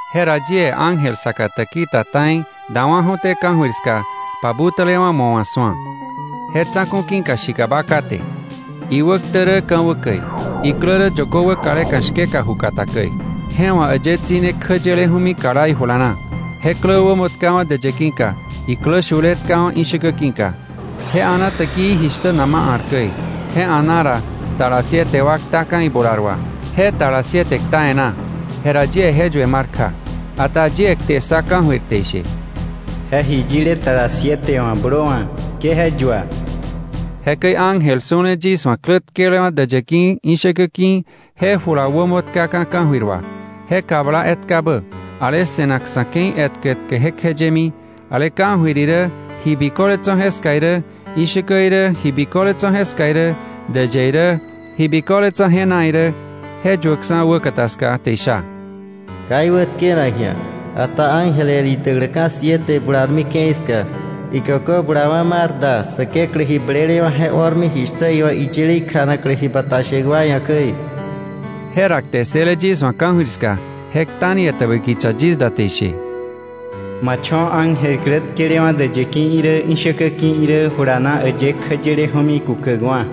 Jera yie ángel saka täki ta ta̱i dawa̱ju̱té ka̱jöir ska pabutälewa̱ mo̱ wa̱ su̱a. Je tsa̱ku̱ ki̱ka shikaba kate̱, iwäktä rä ka̱wä käi, iklä rä yökö wäkaleka̱ shkeka ju kata käi. Je wa̱ äyë tsi̱ne kjä yeleju̱mi kala ijula na. Je klä wämo tkawa̱ däyë ki̱ka, iklä shule tkawa̱ ishäkä ki̱ka. Je a̱na täkii jishtä nama a̱r käi. Je a̱na ra, tala siete wa ktaka̱ ibular wà. Je tala siete kta e̱ná, jera yie je yue mar kja. Ata yie kte ssa ka̱jöir te ishe: “Je ji yile tala siete wa̱ blöwa̱, ke je yua.” Jekäi ángel su̱le yis wa̱ klä tkelewa̱ däyë ki̱, ishäkä ki̱, je jula wämo tkaka̱ ka̱jöir wà, je kabla etkabä, ale se̱nak sa̱ ke̱i etkä etkä jekjeyemi, ale ka̱jöir irä ji biköle tso̱ jeska irä, ishäkä irä ji biköle tso̱ jeska irä, däyë irä ji biköle tso̱ je na irä, je yuäkksa̱ wäkata ska te isha: “Ka iwätkenak ji̱a, ata ángel el idäkläka̱ siete bularmi ke̱i ska, ikökö bulawa̱ mar da Säkeklä ji blelewa̱ je o̱rmi jishtä iwa̱ iyile ikjanaklä ji bata shäk wa ia̱ käi.” Jera kte ssële yis wa̱ ka̱jöir ska, je kta ni etäbä kicha yis da te ishe: “Ma cho̱ ángel klä tkelewa̱ däyë ki̱ irä, ishäkä ki̱ irä jula na äyë kjäyeleju̱mi kukäkwa̱.”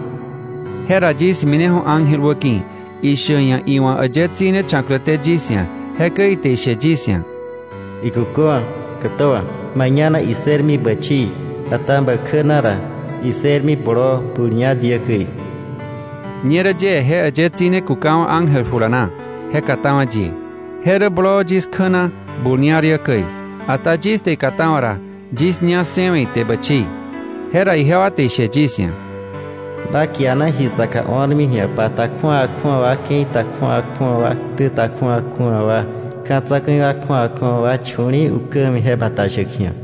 Jera yis mineju̱ ángel wäki̱, ishäk iia̱ iwa̱ äyë tsi̱ne cha̱kläté yis ia̱. Jekäi ite ishe yis ia̱: “Ikuköwa̱, kätöwa̱. Ma ñá na issërmi bächii, ata bä kjä na ra issërmi bloo bul ña diä käi.” Ñerä yie je äyë tsi̱ne kukawa̱ ángel jula na, je katawa̱ yie. Je rä bloo yis kjä na bul ña diä käi, ata yis te ikatawa̱ ra, yis ña ssëwe̱ ite bächii. Jera ijewa te ishe yis ia̱: “Ba kiana ji saka o̱rmi ji̱a, pa ta kju̱awa kju̱awa wa, ke̱i ta kju̱awa kju̱awa wa, ktä ta kju̱awa kju̱awa wa, ka̱ tsa̱ku̱i kju̱awa kju̱awa wa chu̱li̱i̱ ukä ja̱mi, je bata shäk ji̱a.”